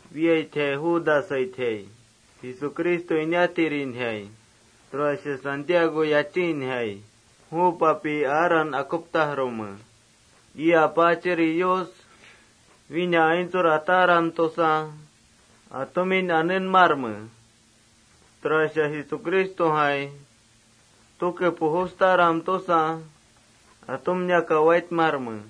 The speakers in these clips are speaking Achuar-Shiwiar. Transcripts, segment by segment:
Wiitjai Judasaitjai. Jesucristo inatirinjai. Tura Santiago yachiinjai. Ju papin aaran akuptajrume. Ii Apaachiri Yus: Wína aintsur ataram tusa atumin anenmarme. Tura Jesucristojai tuke pujustaram tusa atumniaka waitmarme.+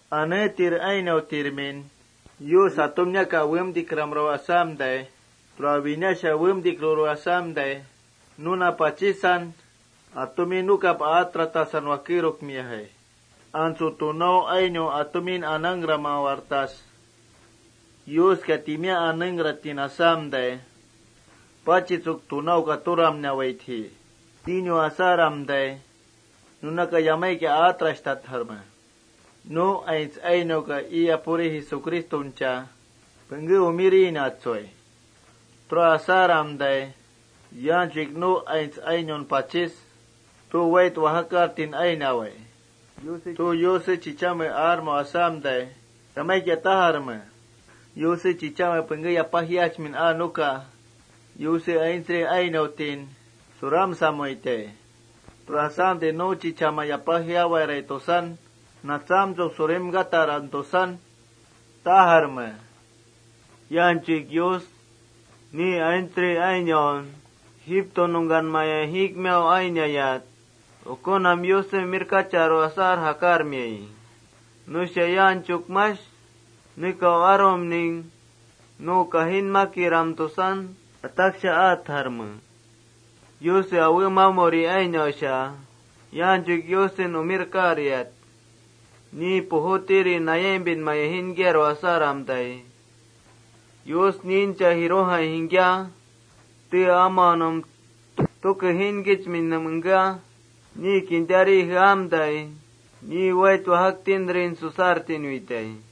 Aneetir ainautirmin, Yus atumniaka uwemtikramrau asamtai, tura winasha uwemtikruru asamtai, nuna pachisan atumin nukap aatratasan wakerukmiajai. Antsu tunau ainau atumin anangkraminak: Yuska timiá anengkratin asamtai, pachitsuk tunauka turamnawaitji tinu asaramtai, nunaka yamaikia aatrashtatjarme. Nu aints ainauka ii Apuri Jesucristoncha pengké umirinatsui. Tura asaramtai yaanchuik nu aints ainaun pachis: Tu wait wajakartin ainawai, Yuse chichame tu aarmau asamtai, yamaikia tajarme: Yuse chichame pengké yapajiachmin aa nuka Yuse aintsri ainautin suramsawaitji. Tura asamtai nu chichaman yapajiawarai tusaram surimkataram tusan tajarme. Yaanchuik Yus ni aintsri ainaun Egipto nungkanmaya jiikmiau ainayat, ukunam Yusen umirkacharu asar jakarmiayi. Nusha yanchuk mash nekau arumning nu kajinmakiram tusan ataksha aatjarme. Yuse awemamuri ainausha yaanchuik Yusen umirkariat, ni pujutirin nayaimpinmaya jiinkiaru asaramtai, Yus niincha jirujai jingkia, tee amanum tuke jiinkichminnum engkea, ni kintari jeamtai, ni wait wajaktintrin susartinuitai.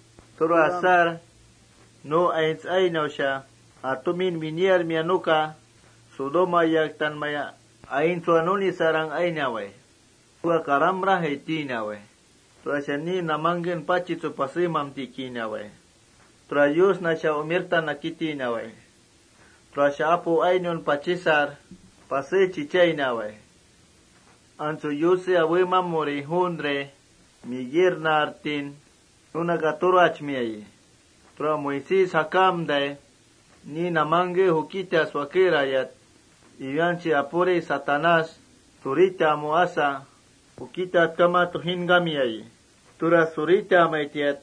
Tura asar nu aints ainausha atumin winiarmia nuka Sodoma yaktanmaya aintsua nunisarang ainawai. Nuka karamrajai tinawai. Tura ni namangken pachitsuk pasemamtikinawai. Tura Yusnasha umirtan nakitinawai. Tura apu ainaun pachisar pasé chichainawai. Antsu Yuse awemamuri juuntri, Miguel naartin nunaka turachmiayi. Antsu Moisés jakamtai, ni namangken jukitas wakerayat, iwianchi apuri Satanás suritamu asa jukitatkama tujinkamiayi. Tura suritamaitiat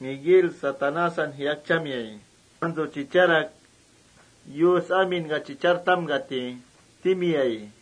Miguel Satanásan jiyakchamiayi. Antsu chicharak: Yus aminka chichartamkati timiayi.+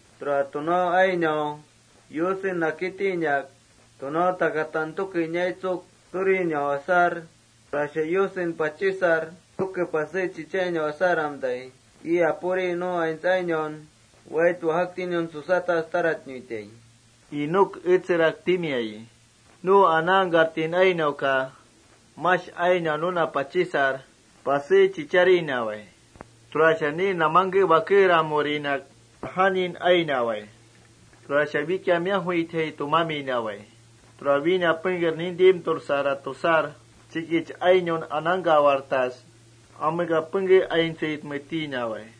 Tura tunau ainau Yusen nakitinak tunau takatan tuke inaitsuk turinau asar, tura Yusen pachisar tuke pasé chichainau asaramtai, ii Apuri nu aints ainaun wait wajaktiniun susatas taratnuitai,” Enoc etserak timiayi. Nu anangkartin ainauka mash ainia nuna pachisar pasé chichainawai. Tura ni namangke wakeramurinak najanin ainawai. Tura wikia miajuitjai tumaminawai. Tura wína pengker nintimtursarat tusar, chikich ainaun anangkawartas: Ameka pengke aintsuitme tinawai.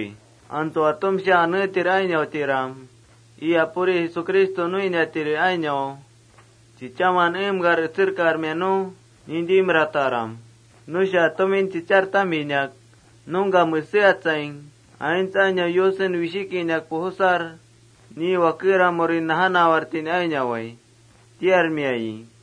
Atumsha aneetir ainautiram, ii Apuri Jesucristo nuiniatiri ainau chichaman eemkar etserkarmia nu nintimrataram. Nusha atumin chichartaminak: “Nungka meseatsaing, aints ainau Yusen wishikinak pujusar, ni wakeramurin najanawartin ainawai,” tiarmiayi.+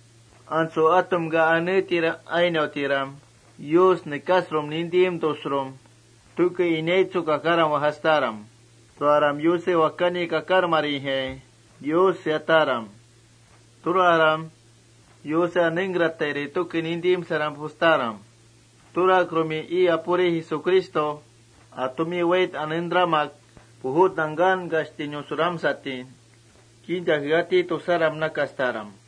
Antsu atumka, aneetir ainautiram, Yus nekasampita tusaram tuke inaitsuk kakaram wajastaram. Tura Yuse Wakani kakarmarijai Yus seataram. Tura Yuse anengkratairi tuke nintimsaram pujustaram. Turakrumin ii Apuri Jesucristo atumin wait anentramak pujut nangkankashtinun suramsatin kinta jeati tusaram nakastaram.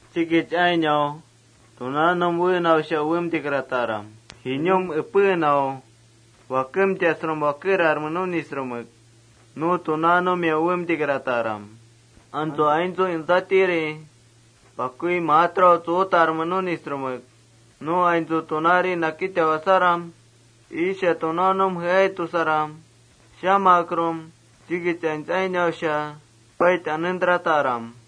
Chikich ainau tunaunum pujuinau jinum epenau wakemtasrum wakerarme nunisrumek tunaanumia uwemtikrataram. Antsu aintsu entsatiri pakui maatrau tsuutarme nunisrumek nu aintsu tunaari nakitau asaram: Iisha tunaanum jeai tusaram, chikich aints wait anentrataram.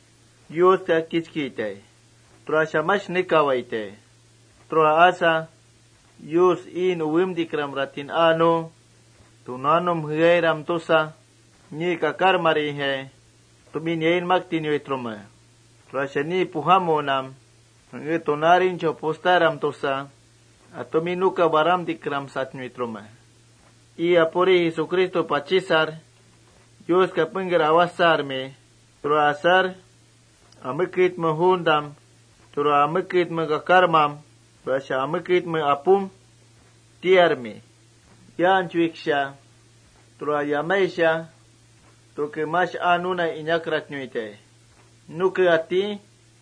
Yuska kichkitai. Tura mash nekawaitai. Tura asa Yus iin Uwemtikramratin aa nu: Tunaunum jeairam tusa, ni kakarmarijai atumin yainmaktinuitrume. Tura ni pujamunam pengké tunaarinchau pujustaram tusa, atumin nukap waramtikramsatnuitrume. Tura asamtai ii Apuri Jesucristo pachisar Yuska pengker awajsarmi. Tura asar: Ameketme juuntam tura Ameketme kakarmam, tura Ameketme Apum tiarmi. Yaanchuiksha, tura yamaisha tuke mash aa nuna inakratnuitai. Tu atí.